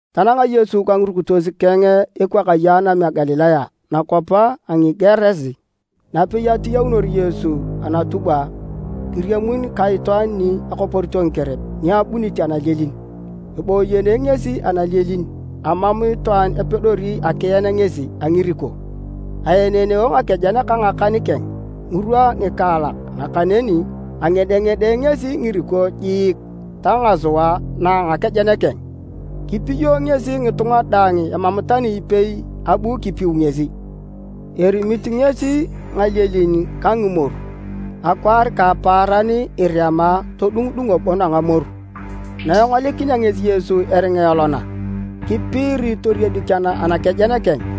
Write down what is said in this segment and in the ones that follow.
Tananga Yesu ka ngirukitos keng ekwakaye a anam a Galilaya nakwap a Ngigerasi. Napei atiyaunor Yesu anatubwa, kiriamun ka itwaan ni akoporito ngikerep ni abunit analielin, eboyeene ngesi analielin. Amam itwaan apedori akien ngesi a ngiriko, aeneeneo ngakejen ka ngakan keng ngirwa ngikaalak nakaneni angedengede ngesi ngiriko jiik ta ngasua na a ngakejen keng. Kipiyo ngesi ngitunga daang emam tani ipei abu kipiu ngesi. Erimit ngesi ngalielin ka ngimoru akwaar ka apaaran irema todungudungo bon a ngamoru. Na engolikinea ngesi Yesu eringa elona, kipiiri toriedik anakejen keng,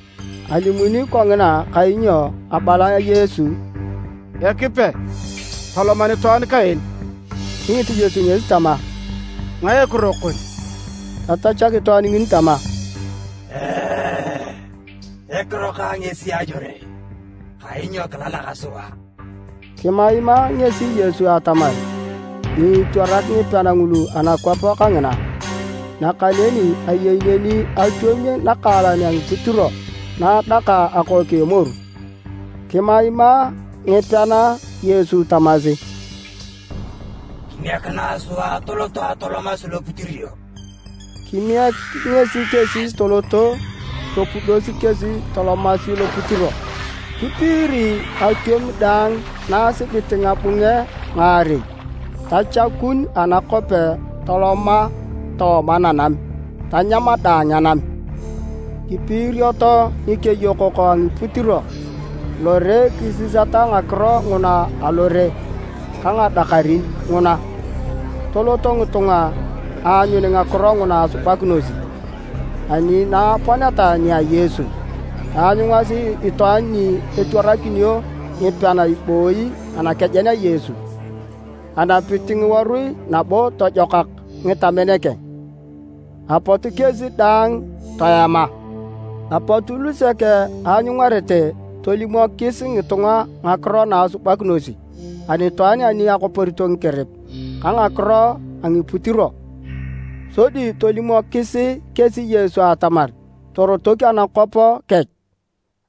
Alimuni kongina kainyo abala Yesu, “Ekipe, tolom anitwaan kaen!”) Kingit Yesu ngesi tama, “Ngae ekiro kon?” Tatachak itwaan ngini tama, “Ekiro kang ngesi Ajore, kainyo kilalak sua!” Kimaima ngesi Yesu atamar nyiitwarak ngipean ngulu anakwap kangina. Nakaneni ayei neni atwom nakaalan a ngiputiro na adaka akook a emoru. Kimaima ngipean Yesu tamasi, “Kimiekinae sua atoloto atolomasi loputiro.” Kimiek ngesi kesi toloto, topudosi kesi tolomasi loputiro. Kipiiri atwom daang, na asibit ngabunge ngaarei, tachakun anakope toloma tooma nanam, tanyam daang anam. Kipiirioto ngikeyokok a ngiputiro lore kisisata ngakiro nguna alore ka ngadakarin nguna. Toloto ngitunga aanyun ngakiro nguna asubakinosi, ani na aponeta nia Yesu, taanyungasi itwaan ni etwaranakinio ngipean ibooyi anakejen a Yesu, enapit ngiworui nabo tojokak ngitamen keng. Apot kesi daang toema. Apot lusek aanyungarete tolimokis ngitunga ngakiro naasubakinosi anitwaan ani akoporito ngikerep ka ngakiro a ngiputiro. Sodi tolimokis kesi Yesu atamar torotok anakwap kech.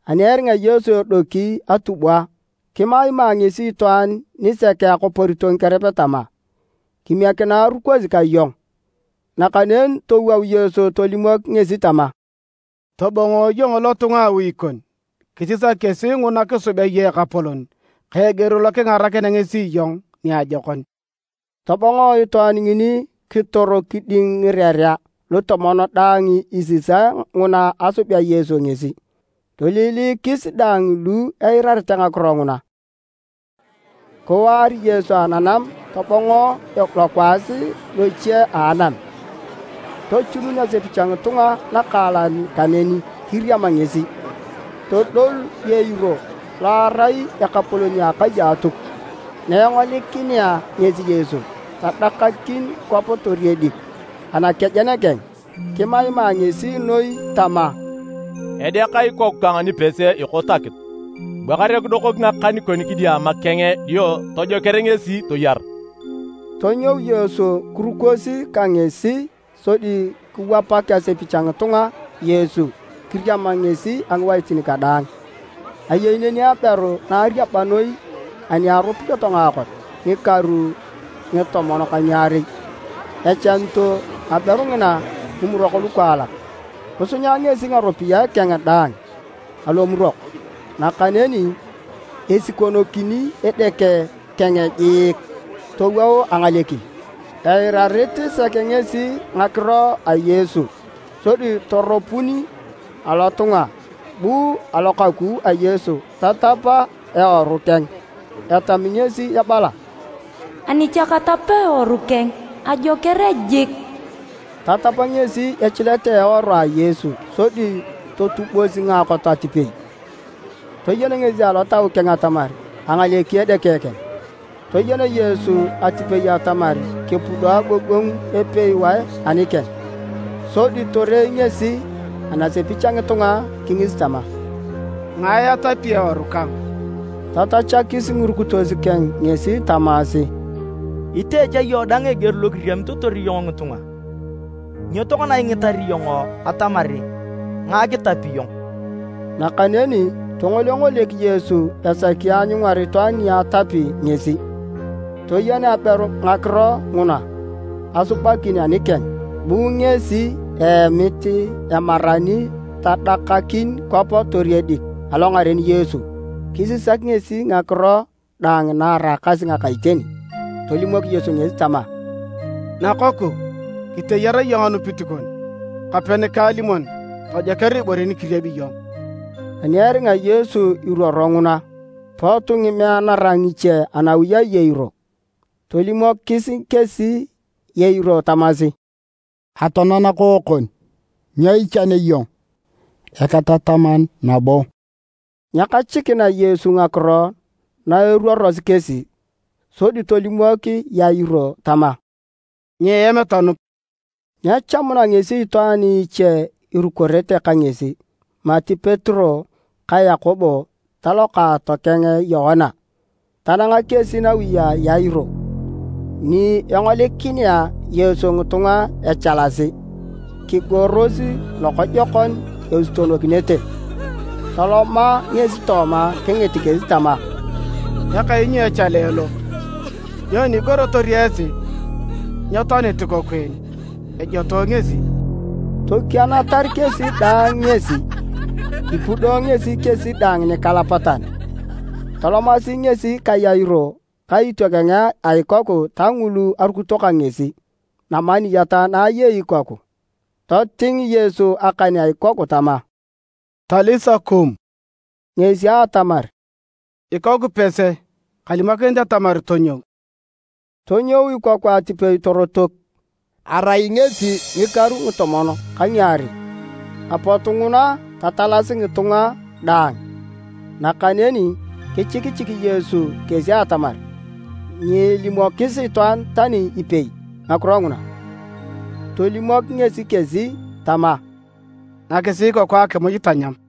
Ani eringa Yesu edoki atubwa, kimaima ngesi itwaan nisek akoporito ngikerep tama, “Kimiekinae erukosi ka iyong!” Nakaneni towou Yesu tolimok ngesi tama, “Tobongo iyong lotunga a awi kon kisisak kesi nguna kisubea iyong Ekapolon ka eger lo kingarakinea ngesi iyong niajokon.” Tobongo itwaan ngini kitor kiding Ngirerea Lutomon daang isisae nguna asubea Yesu ngesi. Toiliilikis daang lu eirarete ngakiro nguna. Kiwaar Yesu ananam tobongo lokwaas loche a anam. Tochunun asepich a ngitunga nakaalan kaneni kiriam ngesi. Todol Yairo lo erai ekapolon a akai a Atuk. Naengolikinea ngesi Yesu, tadakakin kwap toriedik anakejen keng kimaima ngesi noi tama, “Edeak ikoku kang nipese ekot akitu, bua kare kidokok ngakan kon kidiama keng dio tojoker ngesi toyar!” Tonyou Yesu kirukosi ka ngesi. Sodi kiwapak asepich a ngitunga Yesu kiriam ngesi a ngiwaitin kadaang. Ayei neni aberu na ariaba noi ani aropiyoto ngaakot a ngikaru a ngitomon ka ngiarei, echanito aberu ngina ngimurok lukaalak. Kisunya ngesi ngaropiyae keng daang alomurok, nakaneni esikonokin edeke keng jiik towou angalekin. Eirarit sek ngesi ngakiro a Yesu sodi toropun alotunga, bu alokaku a Yesu tatap eworu keng. Etami ngesi ebala, “Ani cha katap eworu keng, ajoker jik.” Tatap ngesi echilet a eworu a Yesu sodi totubos ngaakot atipei. Toyen ngesi alotau keng atamar angaleki edeke keng. Toyen Yesu atipei atamar kepudo agogongu epewae anikeng. Sodi torei ngesi anasepich a ngitunga kingis tama, “Ngae atapi eworu kang?” Tatachakis ngirukitos keng ngesi tamasi, “Itee cha iyong dang eger lokiriamitotor iyong ngitunga. Nyo tokona ingitar iyong atamar ngae kitapi iyong?” Nakaneni tongolengolek Yesu esaki aanyungar itwaan ni atapi ngesi. Toyen aberu ngakiro nguna asubakin anikeng. Bu ngesi eemit emarani tadakakin kwap toriedik alongaren Yesu kisisak ngesi ngakiro daang na eraakasi ngaka iteni. Tolimok Yesu ngesi tama, “Nakoku, kiteyar iyong anupit kon. Kape nikaalimon tojoker ibore ni kiriebi iyong.” Ani eringa Yesu iruoro nguna, pot ngimeanara ngiche anawi a Yairo. Tolimokis kesi Yairo tamasi, “Atoana nakookon. Nyo ichanea iyong Eketataman nabo?” Nyekachikina Yesu ngakiro na eruorosi kesi. Sodi tolimok Yairo tama, “Nyiem tonup.” Nyechamuna ngesi itwaan iche irukorete ka ngesi mati Petero ka Yakobo ta lokaato keng Yoana. Tananga kesi nawi a Yairo ni engolikinea Yesu ngitunga echalasi, kigoros lokojokon esutonokinete. Toloma ngesi tooma kingit kesi tama, “Ekainyo echale lo? Nyoni igorotor esi? Nyetoanit ikoku en, ejotoe ngesi!” Tokianatar kesi daang ngesi. Kipudo ngesi kesi daang nikalapatan. Tolomasi ngesi ka Yairo ka itiokeng a ikoku ta ngulu arukito ka ngesi namaniyat na ayei ikoku. Toting Yesu akan a ikoku tama, “Talisa koum,” ngesi atamar, “Ikoku pese, kalimokinit atamar tonyou!” Tonyou ikoku atipei torotok. (Arai ngesi ngikaru ngitomon ka ngiarei.) Apot nguna tatalasi ngitunga daang! Nakaneni kichikichik Yesu kesi atamar nyeelimokis itwaan tani ipei ngakiro nguna. Tolimok ngesi kesi tama, “Nakisi ikoku akimuj tanyam.”